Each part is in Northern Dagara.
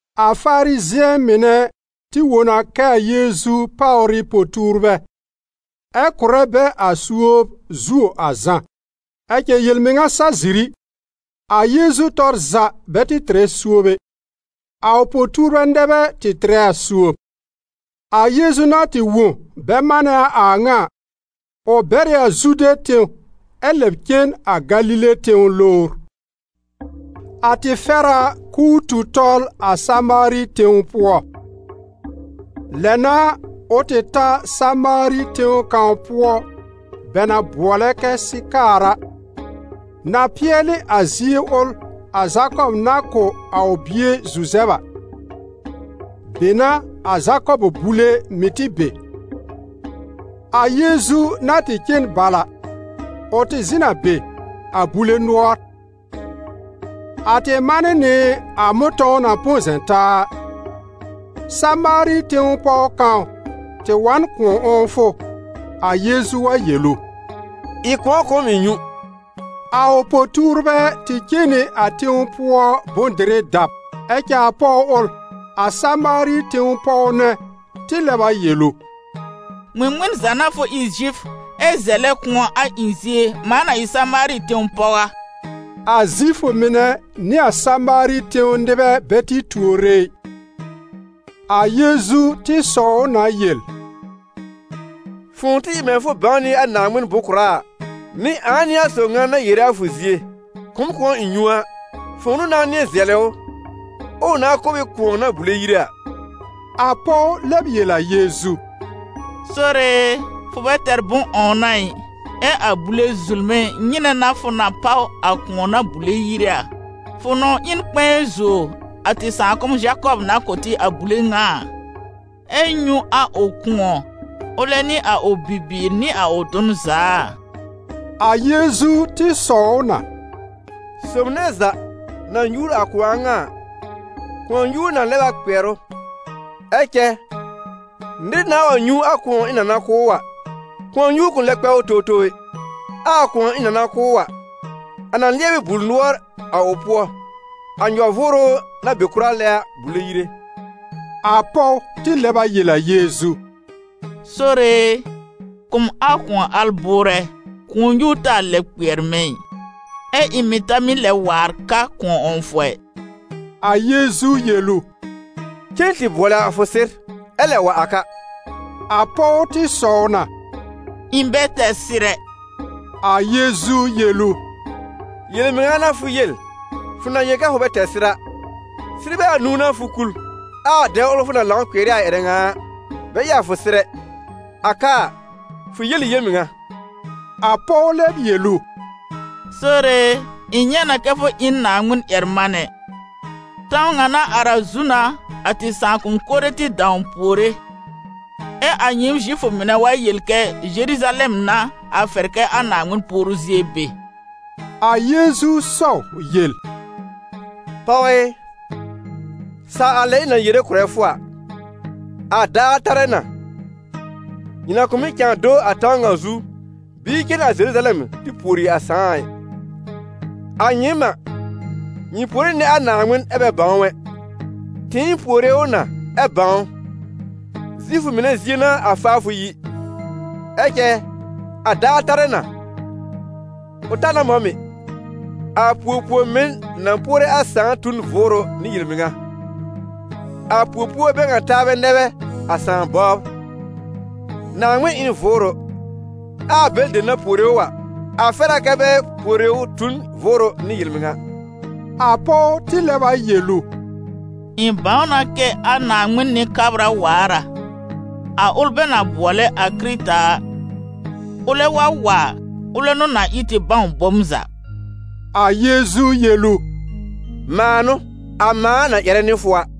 A Farizɩ̃ɛ mɩnɛ tɩ wõ na kɛ a Yeezu páwr ɩ po-tuurbɛ, ɛ kʋ̀rɛ bɛ a suob zuo a Zã. Ɛ cɛ yel-mɩŋa sa ziri, a Yeezu tɔr za bɛ tɩ tɩrɛ suob ɛ, a ʋ po-tuurbɛ nɛ bɛ tɩ tɩrɛ a suob. A Yeezu na tɩ wõ bɛ manɛ a a ŋa a, ʋ bɛr ɩ a Zude tẽw ɛ lɛb cen a Galile tẽw lowr. A tɩ fɛr a k'ʋʋ tu tɔl a Samaari tẽw pʋɔ. Lɛ n'a ʋ tɩ ta Samaari tẽw kãw pʋɔ bɛ na bʋɔlɛ kɛ Sɩkaar a, na pɩɛlɩ a zie ʋl a Zakɔb na kʋ̀ a ʋ bie Zuzɛb a. Be n'a a Zakɔb bule mɩ̀ tɩ be. A Yeezu na tɩ cen bal a, ʋ tɩ zɩ̃ n a be, a bule nʋɔr. A tɩ man nɩ nɩ a mʋ̃tɔ̃w na põ zɛ̃ taa a. Samaari tẽw pɔw kãw tɩ wa n kʋ̃ɔ 'wɔ̃wfʋ, a Yeezu wa yel ʋ: «Ɩ kʋ̃ɔ kʋ̀ m ɩ̃ nyũ.» A ʋ po-tuurbɛ tɩ cen nɩ a tẽw pʋɔ bʋ̃-dɩrɩ dab. Ɛ cɛ a pɔw ʋl, a Samaari tẽw pɔw nɛ, tɩ lɛb a yel ʋ: «Ŋmɩŋmɩn za n'a fʋ ɩ Zifʋ, ɛ zɛlɛ kʋ̃ɔ a ɩ̃ zie, mãa na ɩ Samaari tẽw pɔw a?» A Zifʋ mɩnɛ nɩ a Samaari tẽw nɩbɛ bɛ tɩ tuore ɩ. A Yeezu tɩ sɔw ʋ na yel: «Fʋ̃ʋ tɩ ɩ mɛ̃ fʋ bãw nɩ a Naaŋmɩn bʋ̃-kʋ̀ra a, nɩ ãa n'ɩ a sob ŋa na yere a fʋ zie: ‹Kʋ̀ m kʋ̃ɔ ɩ̃ nyũ› a, fʋ̃ʋ n'ʋ nãá nɩ̃ɛ zɛlɩ ʋ, ɛ ʋ nãá kʋ̀ b ɩ kʋ̃ɔ na bùle yire a.» A pɔw lɛb yel a Yeezu: «Sore e, fʋ bɛ tɛr bʋ̃-'wɔ̃wna ɩ, ɛ a bule zulme, nyɩnɛ n'a fʋ na páw a kʋ̃ɔ na bùle yire a? Fʋ nɔ̃w ɩ n kpɛ̃ɛ zuo a tɩ sãakʋm Zakɔb na kʋ̀ tɩ a bule ŋa a, ɛ nyũ a ʋ kʋ̃ɔ, ʋlɛ nɩ a ʋ bibiir nɩ a ʋ dʋn za a?» A Yeezu tɩ sɔw ʋ na: «Sob nɛ za na nyuur a kʋ̃ɔ a ŋa a, kʋ̃ɔ-nyuur na lɛb a kpɩɛr ʋ. Ɛ cɛ nɩr nãà wa nyũ a kʋ̃ɔ ɩ̃ na na kʋ̀ ʋ a, kʋ̃ɔ-nyuur kʋ̃ lɛ kpɛ ʋ towtow ɛ. Ɛ a kʋ̃ɔ ɩ̃ na na kʋ̀ ʋ a, a na lɩɛb ɩ bul-nʋɔr a ʋ pʋɔ, a nyɔ-vʋʋrʋ na be kʋra lɛ a bùle yire.» A pɔw tɩ lɛb a yel a Yeezu: «Sore e, kʋ̀ m a kʋ̃ɔ al bʋʋrɛ, kʋ̃ɔ-nyuur taa lɛb kpɩɛr mɛ̃ ɩ, ɛ ɩ̃ mɩ̀ ta mɩ́ lɛ waar ka kʋ̃ɔ 'wɔ̃wfʋ ɛ.» A Yeezu yel ʋ: «Cen tɩ bʋɔlɩ a fʋ sɩr, ɛ lɛb wa a ka.» A pɔw tɩ sɔw na: «Ɩ̃ bɛ tɛr sɩr ɛ.» A Yeezu yel ʋ: «Yel-mɩŋa n'a fʋ yel, fʋ na yel kɛ fʋ bɛ tɛr sɩr a; sɩrbɛ anũu n'a fʋ kul, ɛ a dɛb ʋl fʋ na lãw kpɩɛr ɩ a ƴɛrɛ ŋa a, bɛ ɩ a fʋ sɩr ɛ. A ka a, fʋ yel ɩ yel-mɩŋa.» A pɔw lɛb yel ʋ: «Sore e, ɩ̃ nyɛ̃ na kɛ fʋ ɩ n Naaŋmɩn-ƴɛr-manɛ. Tãw ŋa na ar a zu n'a, a tɩ sãakʋm mɩnɛ tɩ dãw puore, ɛ a nyɩɩm Zifʋ mɩnɛ wa yel kɛ Zeruzalɛm n'a a fɛr kɛ a Naaŋmɩn puoru zie be.» A Yeezu sɔw yel: «Pɔw ɩ, saw a lɛ ɩ̃ na yere kʋ̀rɛ fʋ a, a daar tarɛ na, nyɩ na kʋ̃ mɩ́ cãa do a tãw ŋa zu, bɩɩ cen a Zeruzalɛm tɩ pùori a Sãà a ɩ. A nyɩɩm n'a, nyɩ puore nɩ a Naaŋmɩn ɛ bɛ bãw ʋ ɛ, tɩɩm puore ʋ na ɛ bãw ʋ: Zifʋ mɩnɛ zie n'a a faafʋ yi. Ɛ cɛ a daar tarɛ na, ʋ ta na mɔ̃ mɩ̀, a puor-puor-mɩn na puore a Sãà tu n vʋʋrʋ nɩ yel-mɩŋa. A puo-puorbɛ bɛ ŋa taabɛ nɛ bɛ a Sãà bɔbr. Naaŋmɩn ɩ n Vʋʋrʋ, ɛ a bɛlɩ dem na puore ʋ a, a fɛr a kɛ bɛ puore ʋ tu n vʋʋrʋ nɩ yel-mɩŋa.» A pɔw tɩ lɛb a yel ʋ: «Ɩ̃ bãw na kɛ a Kɩrɩta waar a, a ʋl bɛ na bʋɔlɛ a Kɩrɩta a. Ʋlɛ wa wa a, ʋlɛ n'ʋ na ɩ tɩ bãw bom za.» A Yeezu yel ʋ: «Mãa n'ʋ, a mãa na ƴɛrɛ nɩ fʋ a.»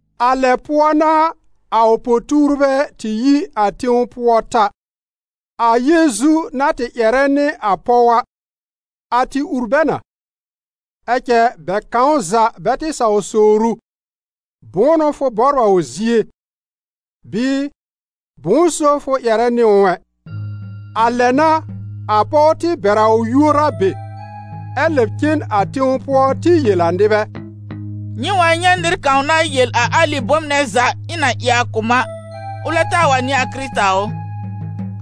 A lɛ pʋɔ n'a a ʋ po-tuurbɛ tɩ yi a tẽw pʋɔ ta. A Yeezu na tɩ ƴɛrɛ nɩ a pɔw a, a tɩ wur bɛ na, ɛ cɛ bɛ kãw za bɛ tɩ saw sowr ʋ: «Bʋ̃ʋ n'ʋ fʋ bɔbr a ʋ zie?» bɩɩ: «Bʋ̃ʋ so fʋ ƴɛrɛ nɩ ʋ ɛ?» A lɛ n'a, a pɔw tɩ bɛr a ʋ yuor a be, ɛ lɛ cen a tẽw pʋɔ tɩ yel a nɩbɛ: «Nyɩ wa nyɛ̃ nɩr kãw na yel a alɩ bome nɛ za ɩ̃ na ɩ a kʋ̀ m a, ʋlɛ taa wa n'ɩ a Kɩrɩta ʋ?»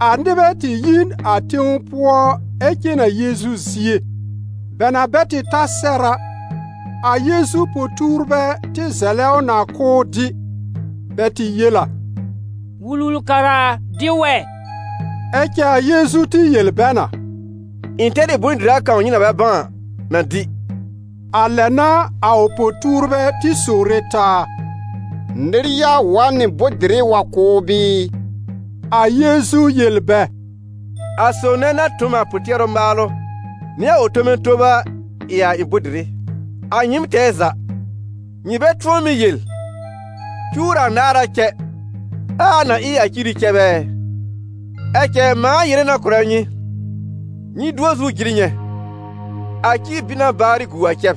A nɩbɛ tɩ yi n a tẽw pʋɔ ɛ cen a Yeezu zie. Bɛ na bɛ tɩ ta sɛr a, a Yeezu po-tuurbɛ tɩ zɛlɛ ʋ na k'ʋʋ dɩ. Bɛ tɩ yel a: «Wul-wul-kara a, dɩ wɛ!» Ɛ cɛ a Yeezu tɩ yel bɛ na: «Ɩ̃ tɛr ɩ bʋ̃-dɩra kãw nyɩ na bɛ bãw a na dɩ.» A lɛ n'a, a ʋ po-tuurbɛ tɩ sowre taa: «Nɩr ya wa n nɩ bʋ̃-dɩrɩ wa kʋ̀ ʋ bɩɩ?» A Yeezu yel bɛ: «A sob nɛ na tõ m a pʋ-tɩɛrʋ maalʋ nɩ a ʋ tome tob a ɩ a ɩ̃ bʋ̃-dɩrɩ. A nyɩɩm tɛɛ za, nyɩ bɛ tʋ̃ɔ mɩ́ yel: ‹Cuwr anaar a cɛ, ɛ a na ɩ a ciri cɛb ɛ?› Ɛ cɛ mãa yere na kʋ̀rɛ nyɩ: nyɩ dʋɔ zu jɩr nyɛ̃: a ci bɩ na baarɩ gu a cɛb.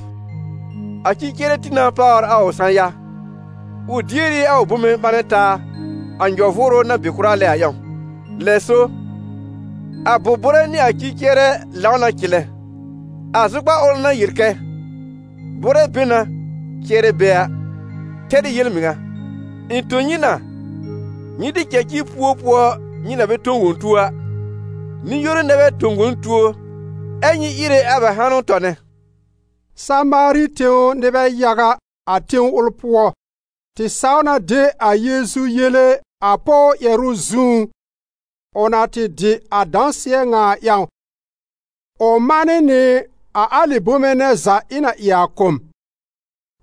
A ci-cɩɛrɛ tĩ na páwr a ʋ sã-ya, ʋ dier ɩ a ʋ bome ɓãnɛ taa a nyɔ-vʋʋrʋ na be kʋra lɛ a ƴãw. Lɛ so, a bʋ̀r-bʋ̀rɛ nɩ a ci-cɩɛrɛ lãw na cɩlɛ. A zʋkpar ʋl na yel kɛ: ‹Bʋ̀rɛ be na, cɩɛrɛ be› a, tɛr ɩ yel-mɩŋa. Ɩ̃ tõ nyɩ na, nyɩ tɩ cɛ ci puo pʋɔ nyɩ na bɛ tõ wõ tuo a, nɩ-yoru nɛ bɛ tõ wõ n tuo ɛ nyɩ íre a bɛ hanʋ tɔnɛ.» Samaari tẽw nɩbɛ yaga, a tẽw ʋl pʋɔ, tɩ saw na de a Yeezu yele a pɔw ƴɛrʋ zũú, ʋ na tɩ dɩ a dãsɩɛ ŋa a ƴãw: «Ʋ manɩ nɩ a alɩ bome nɛ za ɩ̃ na ɩ a a kʋ̀ m.»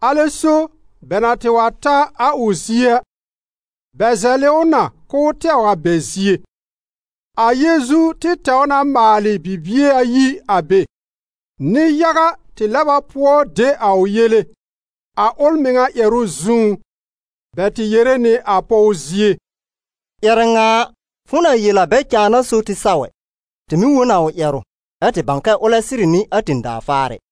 Alɛ so bɛ na tɩ wa ta a ʋ zie a, bɛ zɛlɩ ʋ na k'ʋʋ tɛw a bɛ zie. A Yeezu tɩ tɛw na maalɩ bibie ayi a be. Nɩ-yaga tɩ lɛb a pʋɔ de a ʋ yele, a ʋl mɩŋa ƴɛrʋ zũú. Bɛ tɩ yere nɩ a pɔw zie: «Ƴɛrɛ ŋa a, fʋ̃ʋ na yel a bɛ cãa n'a so tɩ saw ɛ. Tɩ mɩ̀ wõ n a ʋ ƴɛrʋ, ɛ́ tɩ bãw na kɛ ʋlɛ sɩrɩ n'ɩ a tẽ-daa Faarɛ.»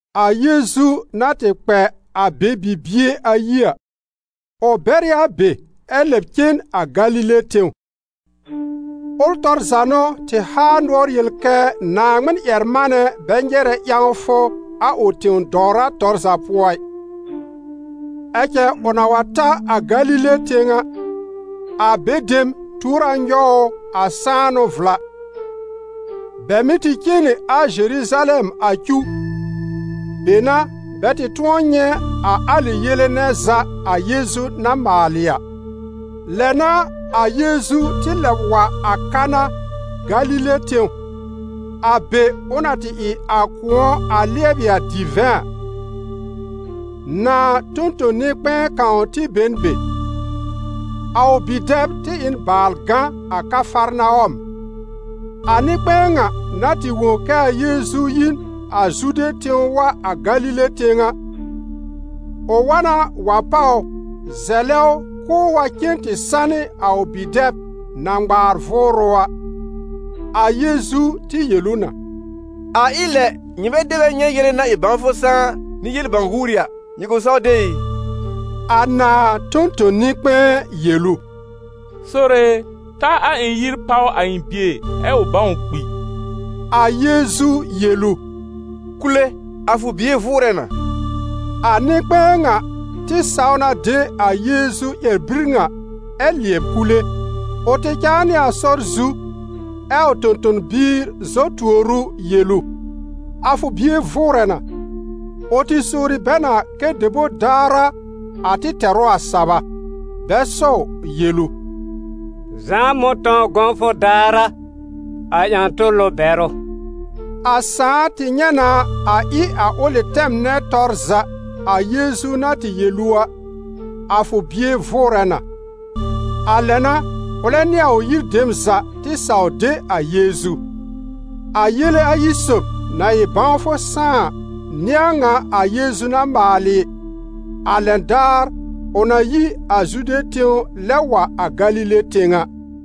A Yeezu na tɩ kpɛ a be bibie ayi a, ʋ bɛr ɩ a be ɛ lɛb cen a Galile tẽw. Ʋl tɔr za n'ʋ tɩ haa nʋɔr yel kɛ Naaŋmɩn-ƴɛr-manɛ bɛ nyɛrɛ ƴãwfʋ a ʋ tẽ-dɔwra tɔr za pʋɔ ɩ. Ɛ cɛ ʋ na wa ta a Galile tẽw a, a be dem tuor a nyɔw ʋ a sãanʋ vla, bɛ mɩ̀ tɩ cen nɩ a Zeruzalɛm a cuw, be n'a bɛ tɩ tʋ̃ɔ nyɛ̃ a alɩ yele nɛ za a Yeezu na maalɩ a. Lɛ n'a a Yeezu tɩ lɛb wa a Kana, Galile tẽw, a be ʋ na tɩ ɩ a kʋ̃ɔ a lɩɛbɩ a divɛ̃ a. Nãà tõ-tõ-nɩ-kpɛ̃ɛ kãw tɩ be n be; a ʋ bi-dɛb tɩ ɩ n baal gã a Kafarnawɔm. A nɩ-kpɛ̃ɛ ŋa na tɩ wõ kɛ a Yeezu yi n a Zude tẽw wa a Galile tẽw a, ʋ wa na wa páw ʋ zɛlɛ ʋ k'ʋʋ wa cen tɩ sanɩ a ʋ bi-dɛb na ŋmaar vʋʋrʋ a. A Yeezu tɩ yel ʋ na: «A ɩ lɛ nyɩmɛ dɛ bɛ nyɛ̃ yele-na-ɩ-bãwfʋ-sãá nɩ yel-bãw-guuri a, nyɩ kʋ̃ saw de ɩ?» A nãà tõ-tõ-nɩ-kpɛ̃ɛ yel ʋ: «Sore e, ta a ɩ̃ yir páw a ɩ̃ bie, ɛ ʋ bãw kpi!» A Yeezu yel ʋ: «Kule, a fʋ bie vʋʋrɛ na.» A nɩ-kpɛ̃ɛ ŋa tɩ saw na de a Yeezu ƴɛr-bir ŋa ɛ lɩɛb kule. Ʋ tɩ cãa nɩ a sɔr zu, ɛ a ʋ tõ-tõ-biir zɔ tuor ʋ yel ʋ: «A fʋ bie vʋʋrɛ na!» Ʋ tɩ sowri bɛ na kɛ debor daar a a tɩ tɛr ʋ a saba. Bɛ sɔw yel ʋ: «Zã̀á mʋ̃tɔ̃w gɔ̃wfʋ daar a a ƴã-tʋlʋ bɛr ʋ.» A sãà tɩ nyɛ̃ na a ɩ a ʋlɩ tɛm nɛ tɔr za a Yeezu na tɩ yel ʋ a: «A fʋ bie vʋʋrɛ na.» A lɛ n'a ʋlɛ nɩ a ʋ yir dem za tɩ saw de a Yeezu. A yele ayi sob, na ɩ bãwfʋ sãá a, n'ɩ a ŋa a Yeezu na maalɩ, a lɛn daar ʋ na yi a Zude tẽw lɛb wa a Galile tẽw a.